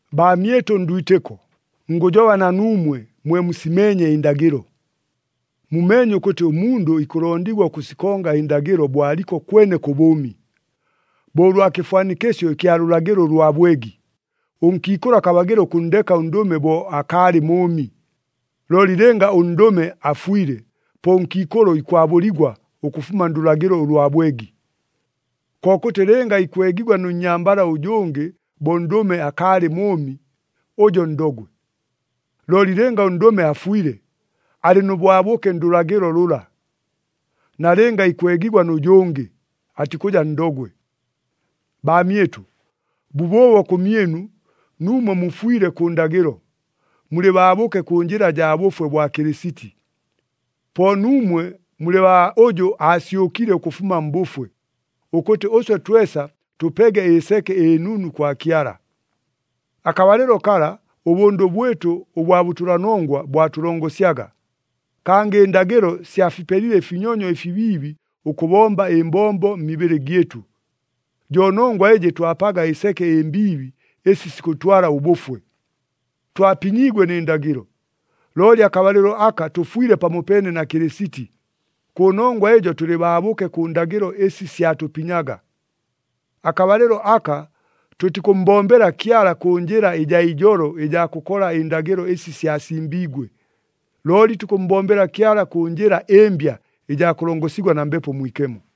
Baamyɨtʉ ndwitɨko, ngʉjoba na nuumwe, mwe musimeenye ɨndagɨlo. Mumeenye ʉkʉtɨ ʉmundʉ ikʉlondigwa ʉkʉsikonga ɨndagɨlo bo aliko kwene kʉ bʉʉmi. Bo ʉlwa kɨfwanikɨsyo ɨkya lʉlagɨlo ʉlwa bwegi, ʉnkiikʉlʉ akabagɨla ʉkʉnndeka ʉndʉme bo akaalɨ mʉʉmi. Looli lɨnga ʉndʉme afwile, po ʉnkiikʉlʉ ikwabʉligwa ʉkʉfuma ndʉlagɨlo ʉlwa bwegi. Kokʉtɨ lɨnga ikwegigwa nʉ nnyambala ʉjʉngɨ bo ʉndʉme akaalɨ mʉʉmi, ʉjo ndogwe. Looli lɨnga ʉndʉme afwile, alɨ nʉ bwabʉke ndʉlagɨlo lʉla. Nalɨnga ikwegigwa nʉ jʉngɨ, atikʉja ndogwe. Baamyɨtʉ, bʉbʉʉbo kʉmyɨnu, nuumwe mufwile kʉ ndagɨlo, mulɨ baabʉke kʉ njɨla jaa bʉfwe bwa Kɨlɨsiti. Po nuumwe mulɨ baa ʉjʉ aasyʉkile ʉkʉfuma mbʉfwe, ʉkʉtɨ ʉswe twesa tʉpege ɨseke ɨnunu kwa Kyala. Akabalɨlo kala, ʉbʉndʉ bwɨtʉ ʉbwa bʉtʉlanongwa bwatʉlongosyaga, kangɨ ɨndagɨlo syafipelile ɨfinyonyo ɨfibiibi ʉkʉbomba ɨmbombo mmibɨlɨ gyɨtʉ. Jo nongwa ɨjɨ twapaga ɨseke ɨmbiibi ɨsi sikʉtwala ʉbʉfwe. Twapinyiigwe nɨ ndagɨlo, looli akabalɨlo aka tʉfwile pamopeene na Kɨlɨsiti, kʉnongwa ɨjo tʉlɨ baabʉke kʉ ndagɨlo ɨsi syatʉpinyaga. Akabalɨlo aka tʉtikʉmmbombela Kyala kʉ njɨla ɨjaa ijolo ɨjaa kʉkola ɨndagɨlo ɨsi syasimbiigwe, looli tukʉmmbombela Kyala kʉ njɨla ɨmbya ɨjaa kʉlongosigwa na Mbepo Mwikemo.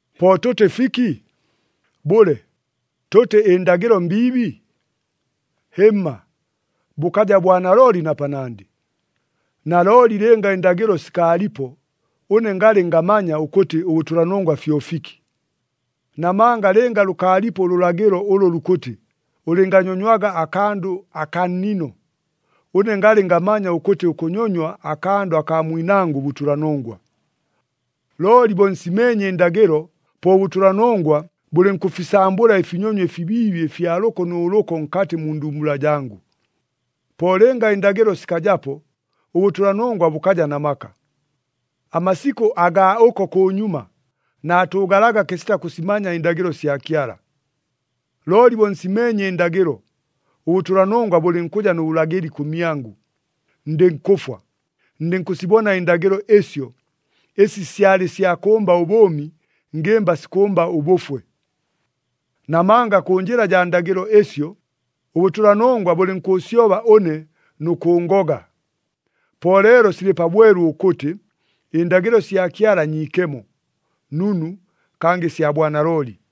Po tʉtɨ fiki? Bʉle, tʉtɨ ɨndagɨlo mbiibi? Hɨmma, bʉkaja bwanalooli na panandɨ! Nalooli lɨnga ɨndagɨlo sikaalipo, ʉne ngalɨ ngamanya ʉkʉtɨ ʉbʉtʉlanongwa fyo fiki. Namanga lɨnga lʉkaalipo ʉlʉlagɨlo ʉlʉ lukʉtɨ, “Ʉlɨnganyonywaga akandʉ akaa nnino,” ʉne ngalɨ ngamanya ʉkʉtɨ ʉkʉnyonywa akandʉ akaa mwinangʉ bʉtʉlanongwa. Looli bo nsimeenye ɨndagɨlo, po ʉbʉtʉlanongwa bʉlɨnkʉfisambʉla ɨfinyonyo ɨfibiibi ɨfya lʉko nʉ lʉko nkatɨ mu ndumbula jangʉ. Po lɨnga ɨndagɨlo sikajapo, ʉbʉtʉlanongwa bʉkaja na maka. Amasikʉ agaa ʉko kʉnyuma, naatʉʉgalaga kɨsita kʉsimanya ɨndagɨlo sya Kyala. Looli bo nsimeenye ɨndagɨlo, ʉbʉtʉlanongwa bʉlɨnkʉja nʉ bʉlagɨli kʉmyangʉ, ndɨnkʉfwa, ndɨnkʉsibona ɨndagɨlo ɨsyo, ɨsi syalɨ sya kʉmba ʉbʉʉmi, ngɨmba sikʉmba ʉbʉfwe. Namanga kʉ njɨla jaa ndagɨlo ɨsyo, ʉbʉtʉlanongwa bʉlɨnkʉʉsyoba ʉne nʉ kʉʉngoga. Po leelo silɨ pabwelu ʉkʉtɨ, ɨndagɨlo sya Kyala nyiikemo, nunu, kangɨ sya bwanalooli.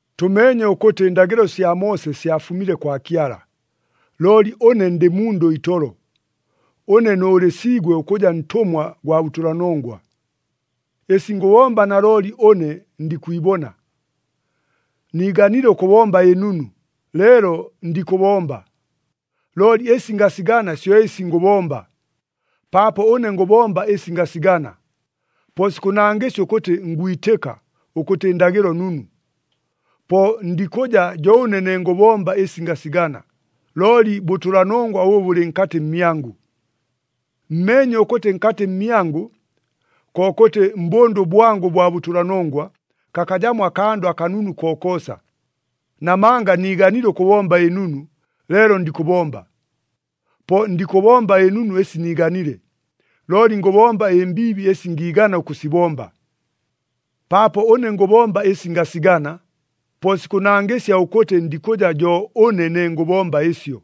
Tʉmeenye ʉkʉtɨ ɨndagɨlo sya Moose syafumile kwa Kyala, looli ʉne ndɨ mundʉ itolo, ʉne nʉʉlɨsiigwe ʉkʉja ntʉmwa gwa bʉtʉlanongwa. Ɨsi ngʉbomba nalooli ʉne ndikwibona. Niiganile ʉkʉbomba ɨnunu, leelo ndikʉbomba. Looli ɨsi ngasigana syo ɨsi ngʉbomba. Paapo ʉne ngʉbomba ɨsi ngasigana, po sikʉnangɨsya ʉkʉtɨ ngwitɨka, ʉkʉtɨ ɨndagɨlo nunu. Po ndikʉja jo ʉne ne ngʉbomba ɨsi ngasigana, looli bʉtʉlanongwa ʉbʉ bʉlɨ nkatɨ mmyangʉ. Mmeenye ʉkʉtɨ nkatɨ mmyangʉ, kokʉtɨ mbʉndʉ bwangʉ ʉbwa bʉtʉlanongwa, kakajamo akandʉ akanunu kokoosa. Namanga niiganile ʉkʉbomba ɨnunu, leelo ndikʉbomba. Po ndikʉbomba ɨnunu ɨsi niiganile, looli ngʉbomba ɨmbiibi ɨsi ngiigana ʉkʉsibomba. Paapo ʉne ngʉbomba ɨsi ngasigana, po sikʉnangɨsya ʉkʉtɨ ndikʉja jo ʉne ne ngʉbomba ɨsyo,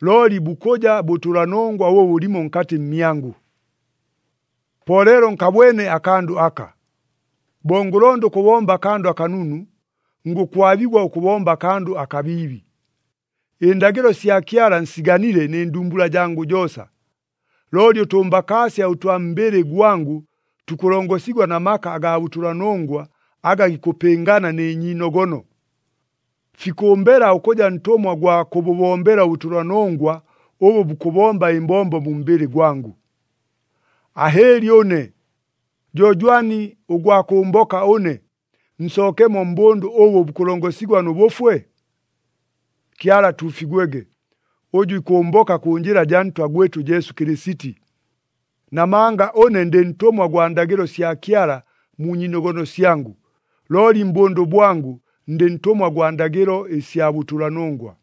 looli bukʉja bʉtʉlanongwa ʉbʉ bʉlimo nkatɨ mmyangʉ. Po leelo nkabwene akandʉ aka: Bo ngʉlonda ʉkʉbomba akandʉ akanunu, ngʉkwabigwa ʉkʉbomba akandʉ akabiibi. Ɨndagɨlo sya Kyala nsiganile nɨ ndumbula jangʉ joosa. Looli ʉtʉmbakaasya ʉtwa mbɨlɨ gwangʉ tukʉlongosigwa na maka agaa bʉtʉlanongwa aga gikʉpɨngana nɨ nyiinogono. Fikʉmbela ʉkʉja ntʉmwa gwa kʉbʉbombela ʉbʉtʉlanongwa ʉbʉ bukʉbomba ɨmbombo mu mbɨlɨ gwangʉ. Ahɨɨli ʉne! Jo jwani ʉgwa kʉmboka ʉne, nsookemo mbʉndʉ ʉbʉ bukʉlongosigwa nʉ bʉfwe? Kyala atuufigwege, ʉjʉ ikʉmboka kʉ njɨla jaa Ntwa gwɨtʉ Jesu Kɨlɨsiti! Namanga ʉne ndɨ ntʉmwa gwa ndagɨlo sya Kyala mu nyiinogono syangʉ, looli mbʉndʉ bwangʉ, ndɨ ntʉmwa gwa ndagɨlo ɨsya bʉtʉlanongwa.